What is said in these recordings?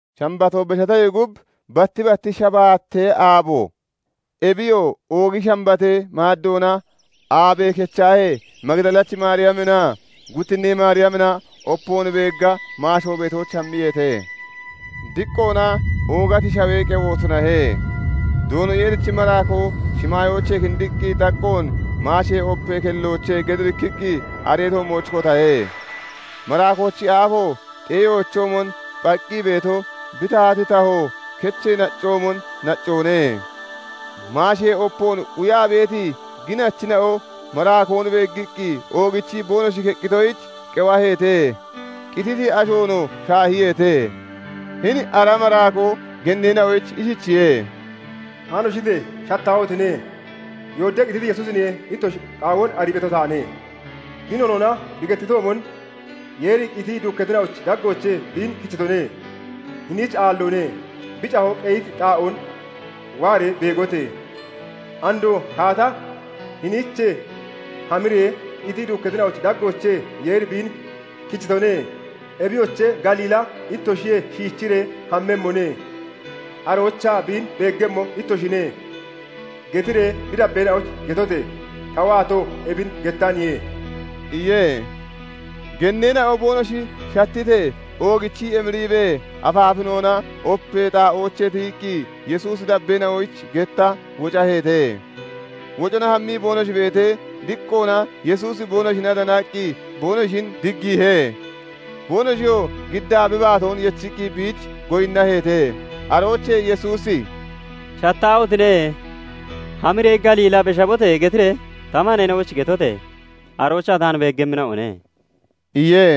Shambatoo beshatoyee gub batti batti shabaatee aabo, ebiyoo oogi shambatee maaddoona aabe kechahee, Magidalachi Maariyaminaa guttinnee Maariyamina opoon beegga maasho beetooch hammiyeete. Diqqoona oogati shawee qewo tunahe; Doono Yeerichi maraakoo shimaayoochee kindiqqi xaqqoon maashee opee kellochee gedirikkiqqi aree toommooch kotahe. Maraakoochi aafo xeeyoochoomon phaqqi beeto, bi tahati taho kecho naccoomon naccoone. Maashee opoon quyaa beeti ginachina'o maraakoon beeggiqqi oogichii boonoshi keqqitoyich qewaheete; qititi ashoonoo shaahiyeete. Hini ara maraakoo genneena'oyich ishichiye:- "Haanoshite! Shattaahotine! Yoodee qititi Yesuusin ittoshi qaawoon arii beeto taane. Bi noonoona bi gettitoomon Yeeri qitii duukkatina'ochi daggoochee biin kichitone; hiniich aalloone. Bi cahoo qeyiti xaa'oon waaree beegote! Andoo kaata hiniichee hamiree, 'Qitii duukkatina'ochi daggoochee Yeeri biin kichitone; ebiyoche, Galiilla ittoshiyee shiichiree hammemmone; aroochaa biin beeggemmo ittoshine' getiree bi dabbeena'oyich getote! Ta waato ebin gettaniye" iye. Genneena'oo boonoshi shattitee, oogichii emiriibee afaafinoona opee xaa'oochee tiyiqqi Yesuusi dabbeena'oyich getta wocaheete. Wocona hammii boonoshi beetee, diqqoona Yesuusi boonoshina danaqqi boonoshin diggiihe. Boonoshiyoo giddaa bi baatoon yechiqqi biich goyinnaheete. Aroochee Yesuusi "Shattaahotine! Hamiree, 'Galiila beshabote!' getiree ta maneena'oyich getote! Aroochaa taan beeggemmina'one" iye.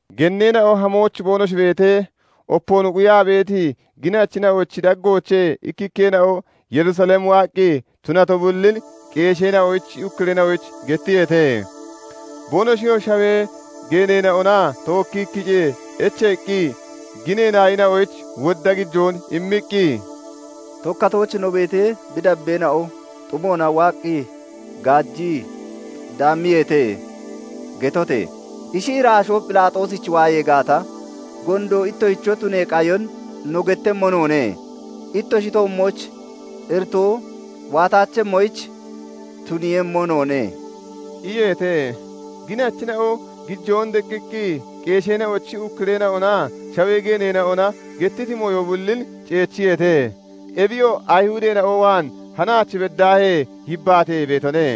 Genneena'o hamooch boonoshi beetee, opoon quyaa beeti ginachina'ochi daggoochee ikkikkeena'o Yerusalem waaqqi tunato bullin qeesheena'ochi ukkureena'oyich gettiyeete. Boonoshiyoo shawee geeneena'ona tookkii kicee echeeqqi ginee naayina'oyich wodda gijoon immiqqi, " 'Tokkatooch no beetee, bi dabbeena'o xumoona waaqqi gaajii daammiyeete' getote! Ishi iraashoo Phelaaxoosich waayee gaata, gondo ittoshicho tunee qayon no gettemmo noone; ittoshi toommooch iritoo waataachemmoyich tuniiyemmo noone" iyeete. Ginachina'oo gijoon deqqiqqi qeesheena'ochi ukkureena'onaa shawee geeneena'ona gettiti mooyo bullin ceechiyeete. Ebiyoo Ayihudeena'o waan hanaach beddaahee yibbaatee beetone.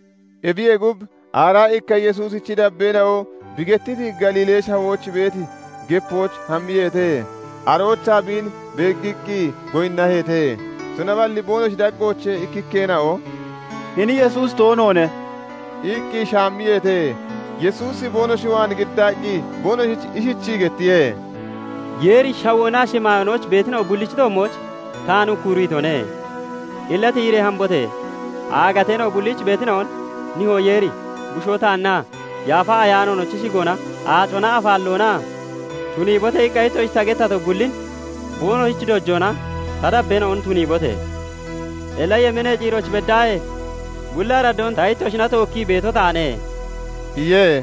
Ebiyee gub, aaraa ikka Yesuusichi dabbeena'o bi gettiti Galiilee Shawooch beeti gepooch hammiyeete. Aroochaa biin beeggiqqi goyinnaheete; tunaballi boonoshi daggoochee ikkikkeena'o "Hini Yesuusi toonoone" iqqi shaammiyeete. Yesuusi boonoshi waan giddaqqi boonoshich ishichii gettiye:- "Yeeri shawoonaa shimaayoonooch beetina'o bullichi toommooch taan ukkuriitone. Illa tiyiree hambote! Aagateena'o bulliich beetina'on nihoo Yeeri, bushoo taannaa Yaafa Ayaanoonochi shigoona aacona afaalloonaa 'Tuniibote!' iqqa ittoshich ta gettato bullin boonoshich dojoona ta dabbeena'on tuniibote! Illa yemeenee ciirooch beddaahee bulli araddoon ta ittoshina tookkii beeto taane" iye.